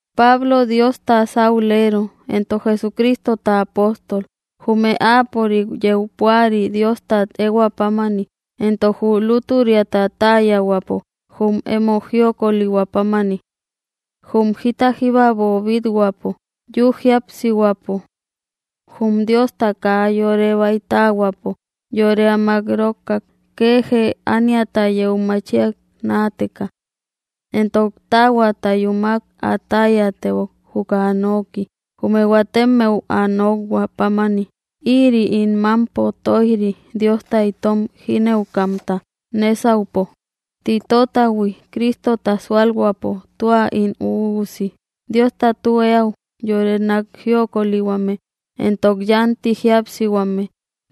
Pablo Diosta saulero éntok Jesucristota apóstol, jume áapörik yeu púari Diostat ehuäpámani, entok jü lúturiata täyahuäpo jum emo jiokölihuä pámani. Jum jita jíba boobít-huäpo yü jíapsihuäpo. Jum Diosta kaa yore baytähuäpo, yore ä mak‑rokkak, kee jee ániata yeu machiay náateka. Éntok taahuata yúmak ä täyatebok juka ä nooki, jume huatemmeu ä nokhuä pámani, ïri ín mampo toijri Diosta itom jínëukamta nésaupo. Titotahui, Cristota súalhuäpo tua ín üusi, Diosta tü eäu, yore nak jiokölihuame, éntok yánti jíapsihuame,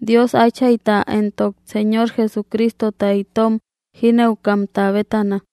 Dios Áchayta entok Señor Jesucristota itom jinëukamta bétana.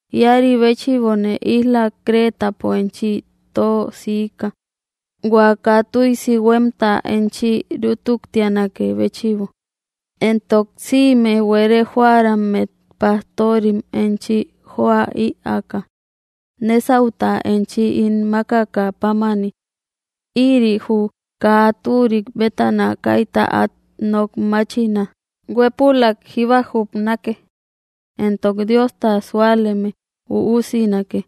Iäri béchïbone isla Cretapo enchi tö siika, hua kaa tüisi huemta enchi rútuktianakë béchïbo, éntok sïme buere joarammet pastorim enchi joa ïaaka, nesauta enchi ín makakä pámani. Ïri, jü kaa turik bétana kaita át nok mátchina, huépulak jíba jubnake, entok Diosta súaleme üusinake,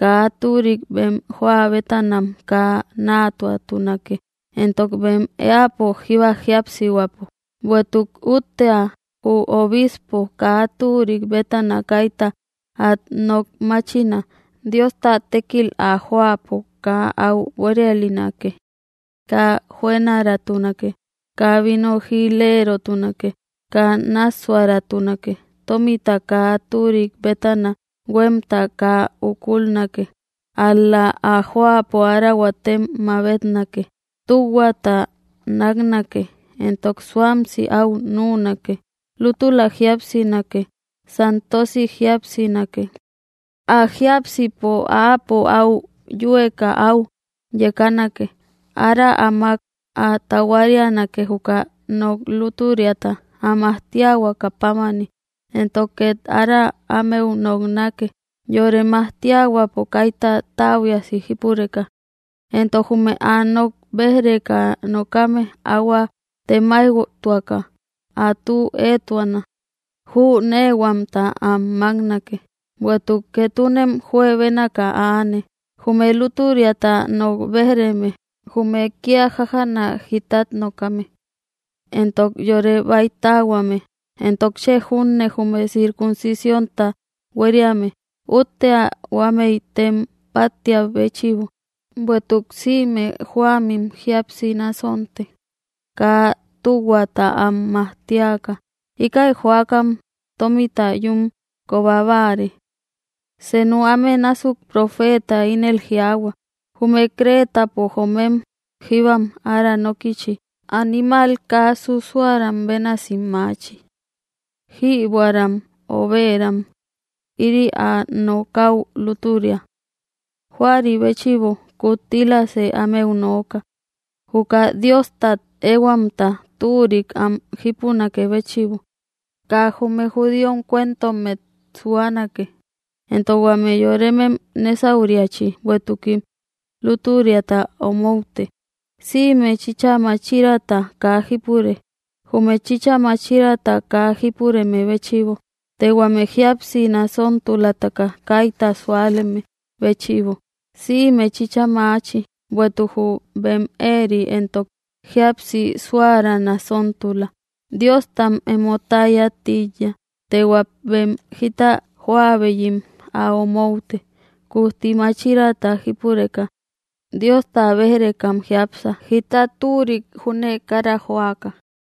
kaa turik bem joa bétanam kaa natuatunake entok bem éäpo jíba jíapsihuäpo. Bueïtuk úttea, jü obispo kaa türik bétana kaita at nok machiná Diosta tékil ä joapo kaa au buérialinake, kaa juënaratunake, kaa vino jïlérotunake, kaa nássuäratunake, tómita kaa türik bétana huemta kaa úkulnake. Al‑la ä joapo ára huatem mabetnake, tühuata naknake, éntok suámsi au nünake, lútula jíapsinake, santosi jíapsinake, ä jiápsäpo áapo au yüeka au yekanake, ára áamak ä tahuarianake juka nok lutüriata, ä majtíahuaka pámani, entok ket ára ámeu noknákë, yore majtihuäpo kayta täbuiasi jípureka, éntok jume ä nok béjreka nokame ahuä temaijtuaka ä tü etuana, jünehuamta am maknake. Bueïtuk ketunem juebénaka aane, jume lútüriata nok béj‑reme, jume kia jájana jítat nokame, entok yore baytähuame, entok chë junne jume circuncisiónta hueriame. Úttea huamei tem páttiabéchïbo; bueïtuk sïme joamim jíapsi násonte kaa tühuata am majtíaka, íkäi joakam tómita yún koba báare. Senu áme násuk profeeta ínel jiaahua: “Jume cretapo joomem jíbam ára nókïchi, animal kaa susuäram bénasim maachi, jïbuäram, obëram.” Ïri ä nokäu lútüria. Juari béchïbo, kuttilasë ámeu nooka, juka Diostat ehuamta türik am jípunakë béchïbo, kaa jume judíom cuentommet suánake, éntok huame yorémem nesauriachi, bueïtukim lútüriata omoute. Sïme chïcha machirata kaa jipure, jume chïcha machirata kaa jipureme béchïbo, të huame jíapsi nasontulataka kaita súaleme béchïbo, sïme chïcha maachi; bueïtuk jü bem éeri éntok jíapsi suära nasóntula. Diostam emo täya tíiya, të hua bem jita jóäubeyim ä omoute. Kujti machirata jípureka, Diosta bej-rekam jiápsa, jita türik júne kara joaka.